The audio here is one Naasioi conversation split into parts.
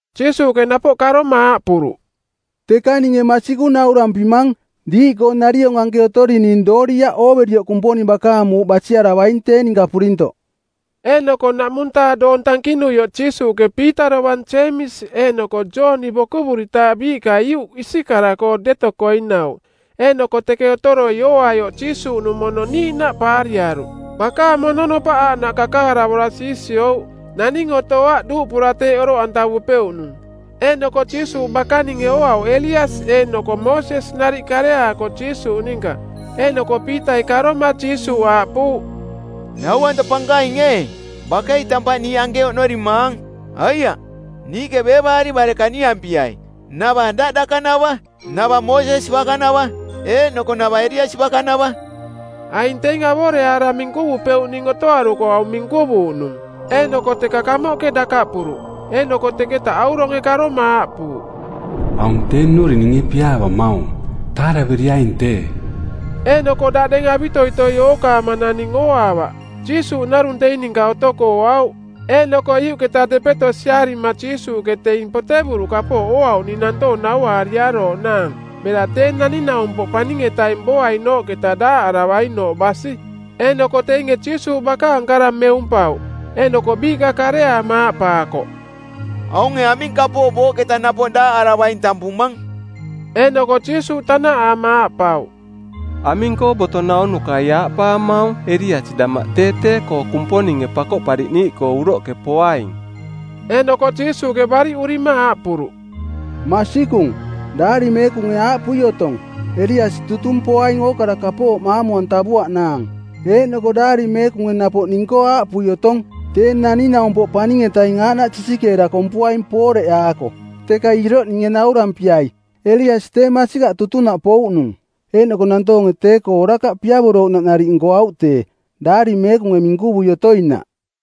Jiisuuꞌke napoꞌ karoma aaꞌpuruꞌ, “Teka ninge masikung naurampimang, Diiꞌkoo nariong anke otorining dooriaꞌ ooverioꞌ Kumponing bakaang Muuꞌ basiaravaing tee ninka purintoꞌ.” Eeꞌnoko ˜naꞌmung-taa doong tankinuioꞌ Jiisuuꞌke Piita dovang Jeemisi eeꞌnoko Jooni bokuvuritaaꞌ biiꞌka iuꞌ isikara-koo deto koinauꞌ, eeꞌnoko teke otoroi ooaioꞌ Jiisuuꞌnung mono niiꞌnaꞌ paariaruꞌ. Bakaang mononopaꞌ aaꞌnaꞌ kakaravora siisiouꞌ. Naning otoaꞌ duuꞌpura teeꞌ oroꞌantavupeuꞌnung. Eeꞌnoko Jiisuuꞌ bakaninge ooauꞌ Eliasi eeꞌnoko Moosesi nariꞌ kareaako Jiisuuꞌ ninka. Eeꞌnoko Piitai karoma Jiisuuꞌ aaꞌpuuꞌ, “Nau-anta Pankaing ee, bakei tampaꞌ niiꞌ anke oꞌnorimaang. Aiaꞌ, niiꞌke beevaari bare kaniampiai: navaꞌ daꞌ dakanavaꞌ, navaꞌ Moosesi bakanavaꞌ, eeꞌnoko navaꞌ Eliasi bakanavaꞌ.” Aing teing avoreaara minkuvupeuꞌning otoaruko aung minkuvuuꞌnung. Eeꞌnoko teka kamoꞌke dakaꞌpuruꞌ, eeꞌnoko teketa auronge karoma aaꞌpuuꞌ, “Aung tee nnuring ninge piaavamaung. Taaraveriaing tee.” Eeꞌnoko daꞌdeng avitoitoi ookaama naning ooaavaꞌ, Jiisuuꞌ narung teing ninka otoko ooauꞌ. Eeꞌnoko iuꞌketa depeto siarima Jiisuuꞌke teing potevuruꞌ kapooꞌ ooauꞌning nantoong nauaariarooꞌnaang bera Tee Naning-naumpoꞌ Paning-etaing booainooꞌketa daaꞌaravainooꞌ basi. Eeꞌnoko teinge Jiisuuꞌ bakaang kara meumpauꞌ, eeꞌnoko biiꞌka kareaama aaꞌpaakoꞌ, “Aunge aming kapooꞌ booꞌketa napoꞌ daaꞌaravaing tampumang?” Eeꞌnoko Jiisuuꞌ tanaꞌaama aaꞌpauꞌ, “Aming-koo boto naunukai aaꞌpaamaung Eliasi damaꞌ tee tee-koo Kumponinge Pakoꞌpariꞌniiꞌkoo uroꞌke poaing?” Eeꞌnoko Jiisuuꞌke bariꞌurima aaꞌpuruꞌ, “Masikung, Daari Meekunge aaꞌpui otong, ‘Eliasi tutung poaing ookara kapooꞌ maamu-antavuaꞌnaang.’ Eeꞌnoko Daari Meekunge napoꞌ ning-koo aaꞌpui otong, ‘Tee Naning-naumpoꞌ Paning-etaing aaꞌnaꞌ sisikeera kompuaing pooreꞌaako.’ Teka iroꞌ ninge naurampiai. Eliasi tee masikaꞌ tutunaꞌ pouꞌnung, eeꞌnoko nantoonge tee-koo orakaꞌ piavorouꞌnaꞌ nariꞌ nkoauꞌ tee, Daari Meekunge minkuvui otoinaꞌ.”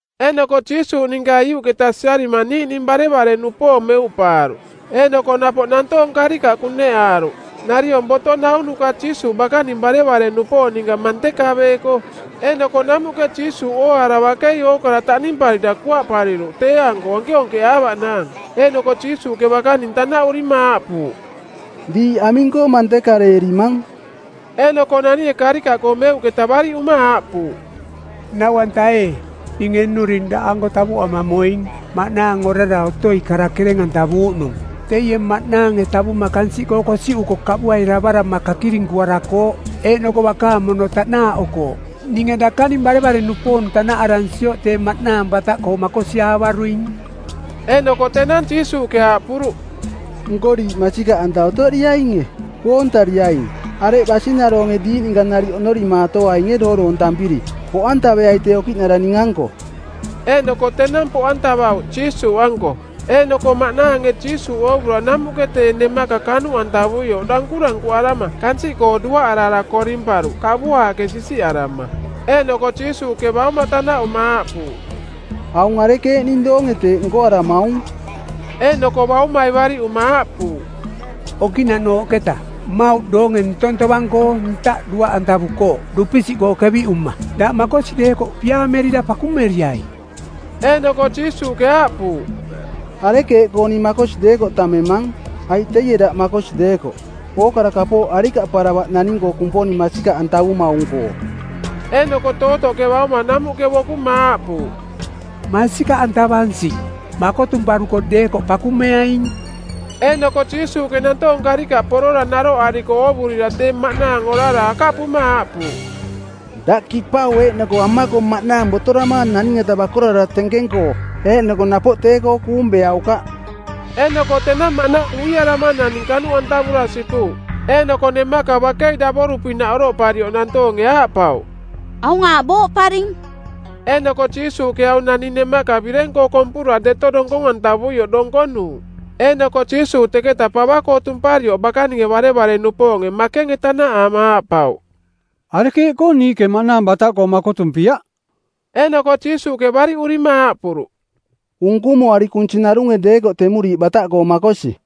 Eeꞌnoko Jiisuuꞌ ninka iuꞌketa siarima niiꞌning barevare-nupoong meuꞌpaaruꞌ, eeꞌnoko napoꞌ nantoong karikaꞌ kuneꞌaaruꞌ, nariong boto naunuka Jiisuuꞌ bakaning barevare-nupoong ninka mantekaveeko. Eeꞌnoko namuꞌke Jiisuuꞌ ooaara bakei ookara taꞌnimparira kuaꞌpariruꞌ tee-anko onkeonkeꞌaavaꞌnaang. Eeꞌnoko Jiisuuꞌke bakaning tanaꞌurima aaꞌpuuꞌ, “Diiꞌ aming-koo mantekareerimang?” Eeꞌnoko naninge karikaꞌkoo meuꞌketa bariꞌuma aaꞌpuuꞌ, “Nau-anta ee, ninge nnuring daꞌanko tavoꞌama moing maꞌnaang orara otoi kara kereng-antavuuꞌnung. Teie maꞌnaange tavuma kansiꞌkoo kosiꞌuko kaꞌbuairavarama kakirinkuarakooꞌ, eeꞌnoko bakaang mono taꞌnaaꞌokooꞌ. Ninge dakaning barevare-nupoong tanaꞌaransioꞌ tee maꞌnaang bataꞌkoo makosiaavaruing.” Eeꞌnoko tenang Jiisuuꞌke aaꞌpuruꞌ, “Nko diiꞌ masikaꞌanta otoriainge, koontariaing, areꞌ basinaroonge diiꞌ ninka nariꞌ oꞌnorimaatoainge dooroontampiri? Poꞌantaveai tee okiꞌnara ning-anko.” Eeꞌnoko tenang poꞌantavauꞌ Jiisuuꞌanko. Eeꞌnoko maꞌnaange Jiisuuꞌ oovura namuꞌke tee nemaka kanuꞌantavuioꞌ dankurankuꞌarama kansiꞌkoo duaꞌarara korimparuꞌ kaꞌbuaaꞌke sisiꞌarama. Eeꞌnoko Jiisuuꞌke bauma tanaꞌuma aaꞌpuuꞌ, “Aung arekeeꞌning doonge teeꞌ nkoaramaung?” Eeꞌnoko baumai bariꞌuma aaꞌpuuꞌ, “Okiꞌnaꞌnooꞌketa. Mmauꞌ doonge ntong tovang-koo ntaꞌ duaꞌantavukooꞌ dupisiꞌkoo keviꞌuma. Daꞌ makosi deekoꞌ piaamerira pakumeriai.” Eeꞌnoko Jiisuuꞌke aaꞌpuuꞌ, “Arekeeꞌkoo ning makosi deekoꞌ tammemang, aiꞌ teie daꞌ makosi deekoꞌ. Ookara kapooꞌ arikaꞌparavaꞌ naning-koo Kumponing masikaꞌantavumaung-koo.” Eeꞌnoko tootoꞌke bauma namuꞌke bokuma aaꞌpuuꞌ, “Masikaꞌantavansing. Makotumparuko deekoꞌ pakumeaing.” Eeꞌnoko Jiisuuꞌke nantoong karikaꞌ porora naroꞌariko oovurira tee maꞌnaang orara akaꞌpuma aaꞌpuuꞌ, “Daꞌ kipau eeꞌnoko amako maꞌnaang botoramaang naning-eta bakorarara tenkeng-koo eeꞌnoko napoꞌ tee-koo kuung beaukaꞌ.” Eeꞌnoko tenang maꞌnaang uiarama naning kanuꞌantavura sipuuꞌ. Eeꞌnoko nemaka bakei davoru-pinaꞌ oroꞌparioꞌ nantoonge aaꞌpauꞌ, “Aung aaꞌ booꞌparing.” Eeꞌnoko Jiisuuꞌke aung naning nemaka bireng-koo kompura deto donkong-antavuioꞌ donkonuuꞌ. Eeꞌnoko Jiisuuꞌ teketa pava-koo tumparioꞌ bakaninge barevare-nupoong makenge tanaꞌaama aaꞌpauꞌ, “Arekeeꞌkoo niiꞌke maꞌnaang bataꞌkoo makotumpiaꞌ?” Eeꞌnoko Jiisuuꞌke bariꞌurima aaꞌpuruꞌ, “Unkumuari kunsi narunge deekoꞌ temuriiꞌ bataꞌkoo makosi.”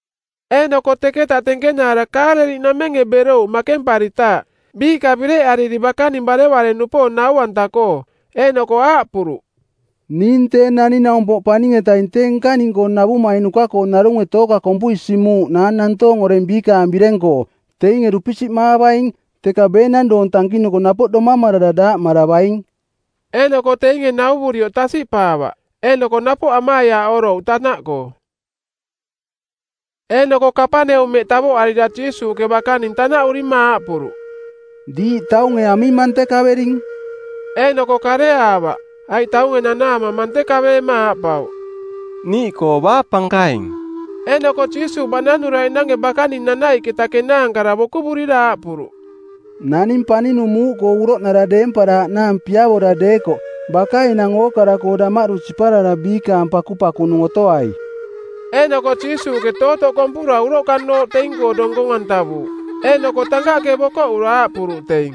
Eeꞌnoko teketa tenkenaara Kaaleliꞌnamenge berouꞌ makemparitaaꞌ, biiꞌka bireꞌariri bakaning barevare-nupoong nau-anta-koo. Eeꞌnoko aaꞌpuruꞌ, “Ning Tee Naning-naumpoꞌ Paning-etaing tee nkaning-koo navumainuka-koo narunge tooka kompui simuuꞌnaang nantoong oreng biikaang bireng-koo. Teinge dupisiꞌmaavaing, teka beenang doong tankinuko napoꞌ domamarara daaꞌmaravaing.” Eeꞌnoko teinge nauvurioꞌ tasiꞌpaavaꞌ, eeꞌnoko napoꞌ amaiaaꞌorouꞌ tanaꞌkoo. Eeꞌnoko Kapaneumeꞌ tavoꞌarira Jiisuuꞌke bakaning tanaꞌurima aaꞌpuruꞌ, “Diiꞌ taunge aming mantekavering?” Eeꞌnoko kareaavaꞌ, aiꞌ taunge nanaama mantekaveema aaꞌpauꞌ, “Niiꞌkoo baa pankaing?” Eeꞌnoko Jiisuuꞌ baꞌnanuraiꞌnange bakaning nanaiꞌketa kenaankara bokuvurira aaꞌpuruꞌ, “Naning paninung muuꞌkoo uroꞌnara deemparaaꞌnaang piavora deekoꞌ, baka enang ookara-koo damaꞌdu siparara biikaang pakupakunung otoai.” Eeꞌnoko Jiisuuꞌke tootoꞌ kompura uroꞌkanooꞌ teing-koo donkong-antavuuꞌ. Eeꞌnoko tankaꞌke bokoꞌura aaꞌpuruꞌ teing,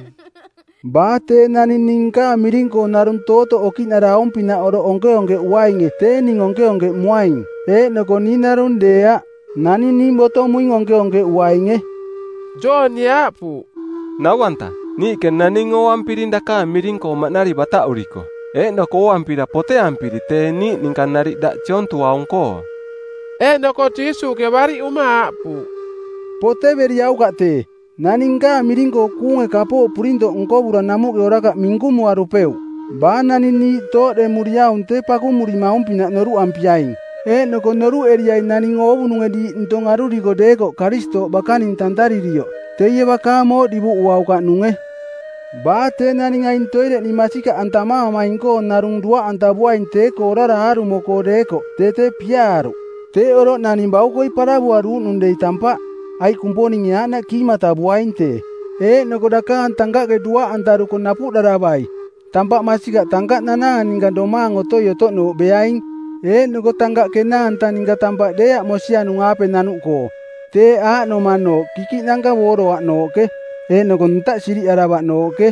“Baa tee naning ning nkaang miring-koo narung tootoꞌ okiꞌnara aung-pinaꞌ oroꞌ onkeonkeꞌuainge tee ning onkeonkeꞌmuaing, eeꞌnoko ning narung deeaꞌ, naning ning botomuing onkeonkeꞌuainge.” Joonie aaꞌpuuꞌ, “Nau-anta, niiꞌke naning ooampiring dakaang miring-koo maꞌnari bataꞌuriko. Eeꞌnoko ooampira poteampiri tee niiꞌ ninka nariꞌ daꞌ siontuaung-koo.” Eeꞌnoko Jiisuuꞌke bariꞌuma aaꞌpuuꞌ, “Poteveriaukaꞌ tee. Naning nkaang miring-koo kuunge kapooꞌ purintoꞌ nkovura namuꞌke orakaꞌ minkumuarupeuꞌ. Baa naning niiꞌ tooꞌdemuriaung tee pakumurimaung-pinaꞌ noruꞌampiaing. Eeꞌnoko noruꞌeriai naning oovununge diiꞌ ntong aruriko deekoꞌ Karistooꞌ bakaning tantaririoꞌ teie bakaang mooꞌ divuꞌuaukaꞌnunge. Baa tee naning aing toireꞌ ning masikaꞌantamaamaing-koo narung duaꞌantavuaing tee-koo orara aarumo-koo deekoꞌ tee tee piaaruꞌ. Teeꞌ oroꞌ naning baukoi paravuaruuꞌnung dei tampaꞌ, aiꞌ Kumponinge aaꞌnaꞌ kiimatavuaing tee. Eeꞌnoko dakaang tankaꞌke duaꞌantaruko napuꞌdaravai. Tampaꞌ masikaꞌ tankaꞌnanaang ninka domaang otoi-otoꞌnooꞌ beaing, eeꞌnoko tankaꞌ kenaanta ninka tampaꞌ deeaꞌ mosianung-aape nanuꞌkoo. Teeꞌ aaꞌnomanooꞌ kikiꞌnanka booroaꞌnooꞌke eeꞌnoko ntaꞌ siriꞌaravaꞌnooꞌke.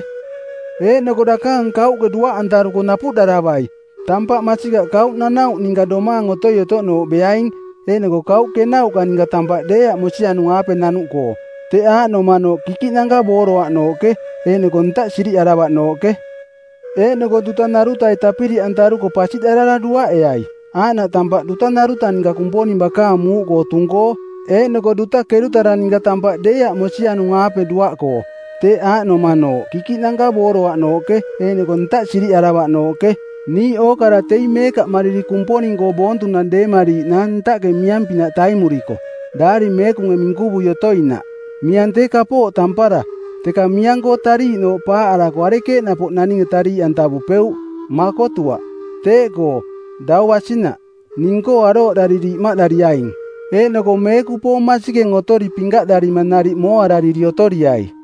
Eeꞌnoko dakaang kauꞌke duaꞌantaruko napuꞌdaravai. Tampaꞌ masikaꞌ kauꞌnanauꞌ ninka domaang otoi-otoꞌnooꞌ beaing, eeꞌnoko kauꞌ kenauꞌka ninka tampaꞌ deeaꞌ mosianung-aape nanuꞌkoo. Teꞌ aaꞌnomanooꞌ kikiꞌnanka booroaꞌnooꞌke eeꞌnoko ntaꞌ siriꞌaravaꞌnooꞌke. Eeꞌnoko duta narutai tapiriꞌantaruko pasiꞌdarara duaꞌeai. Aaꞌnaꞌ tampara duta naruta ninka Kumponing bakaang muuꞌkoo tung-koo eeꞌnoko duta kerutara ninka tampaꞌ deeaꞌ mosianung-aape duaꞌkoo. Teꞌ aaꞌnomanooꞌ kikiꞌnanka booroaꞌnooꞌke eeꞌnoko ntaꞌ siriꞌaravaꞌnooꞌke. Niiꞌ ookara teing meekaꞌmariri Kumponing-koo boontunang deemariiꞌnaang ntaꞌke miang-pinaꞌ taimuriko, Daari Meekunge minkuvui otoinaꞌ. Miang tee kapooꞌ tampara, teka miang-koo tariiꞌnooꞌ paaꞌarako arekeeꞌ napoꞌ naninge tariiꞌantavupeuꞌ? Makotuaꞌ! Teeꞌkoo, dau basinaꞌ, ning-koo arooꞌdariri imaꞌdariaing, eeꞌnoko meekupoong masikeng otori pinkaꞌdarima nariꞌ mooarariri otoriai.”